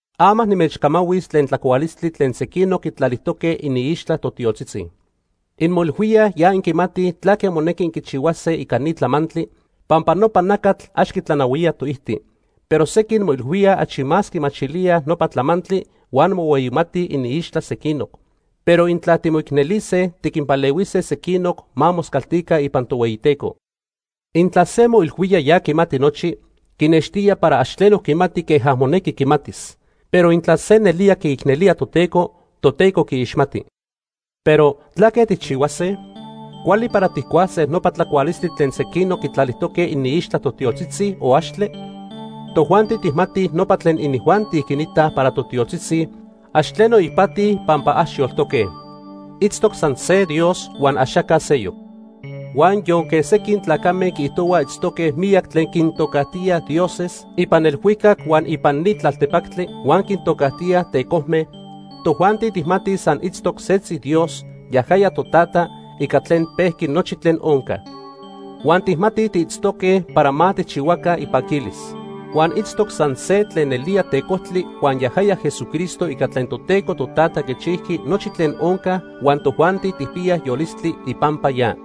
Ama nimechcamahuis tlen tlacualistli tlen sequinoc quitlalijtoque iniixtla totiotzitzi. Inmoilhuíaj ya inquimatij tlaque monequi inquichihuase ica ni tlamantli, pampa nopa nacatl ax quitlanahuía toijti. Pero sequin moilhuía achi más quimachilía nopa tlamantli huan mohueyimatij iniixtla sequinoc. Pero intla timoicnelise tiquinpalehuise sequinoc ma moscaltica ipan Tohueyiteco. Intla se moilhuía ya quimati nochi, quinextía para ax tleno quimati queja monequi quimatis. Pero intla se nelía quiicnelía Toteco, Toteco quiixmati. Pero ¿tlaque tijchihuase? ¿Cuali para tijcuase nopa tlacualistli tlen sequinoc quitlalijtoque iniixtla totiotzitzi, o axtle? Tojuanti tijmatij nopa tlen inijuanti quinitaj para totiotzitzi, ax tleno ipati pampa ax yoltoque. Itztoc san se Dios huan axaca seyoc. Huan yonque sequin tlacame quiijtohuaj itztoque miyac tlen quintocajtía “dioses” ipan elhuicac huan ipan ni tlaltepactli huan quintocajtíaj “tecojme”, tojuanti tijmatij san itztoc setzi Dios, yajaya Totata, ica tlen pejqui nochi tlen onca. Huan tijmatij tiitztoque para ma tijchihuaca ipaquilis. Huan itztoc san se tlen nelía tecojtli huan yajaya Jesucristo ica tlen Toteco Totata quichijqui nochi tlen onca huan tojuanti tijpiyaj yolistli ipampa ya.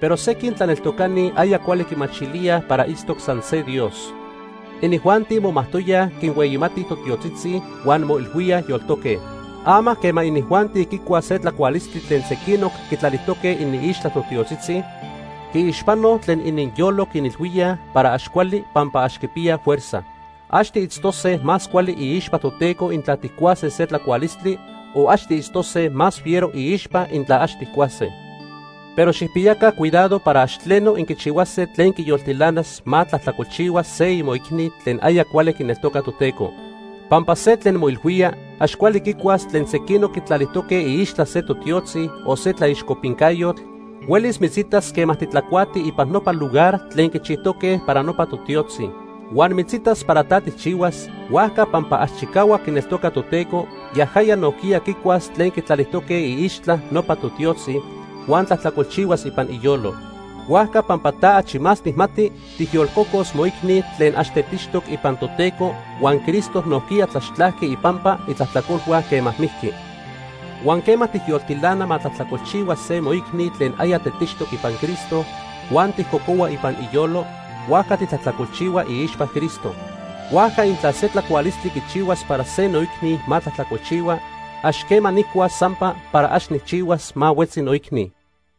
Pero sequin tlaneltocani aya cuali quimachilíaj para itztoc san se Dios. Inijuanti momajtoyaj quinhueyimatij totiotzitzi huan moilhuíaj yoltoque. Ama quema inijuanti quicuaj se tlacualistli tlen sequinoc quitlalijtoque iniixtla totiotzitzi, quiixpanoj tlen ininyolo quinilhuíaj para ax cuali pampa ax quipiyaj fuerza. Ax tiitztose más cuali iixpa Toteco intla tijcuase se tlacualistli, o ax tiitztose más fiero iixpa intla ax tijcuase. Pero xijpiyaca cuidado para ax tleno, inquichihuase tlen quiyoltilanas ma tlajtlacolchihua se imoicni tlen aya cuali quineltoca Toteco. Pampa se tlen moilhuía ax cuali quicuas tlen sequinoc quitlalijtoque iixtla se totiotzi o se tlaixcopincayotl huelis mitzitas quema titlacuati ipan nopa lugar tlen quichijtoque para nopa totiotzi. Huan mitzitas para ta tijchihuas, huajca pampa ax chicahuac quineltoca Toteco, yajaya nojquiya quicuas tlen quitlalijtoque iixtla nopa totiotzi, huan tlajtlacolchihuas ipan iyolo. Huajca pampa ta achi más tijmati, tijyolcocos moicni tlen ax tetixtoc ipan Toteco huan Cristo nojquiya tlaxtlajqui ipampa itlajtlacolhua quema mijqui. Huan quema tijyoltilana ma tlajtlacolchihua se moicni tlen aya tetixtoc ipan Cristo huan tijcocohua ipan iyolo, huajca titlajtlacolchihua iixpa Cristo. Huajca intla se tlacualistli quichihuas para se noicni ma tlajtlacolchihua, ax quema nijcuas sampa para ax nijchihuas ma huetzi noicni.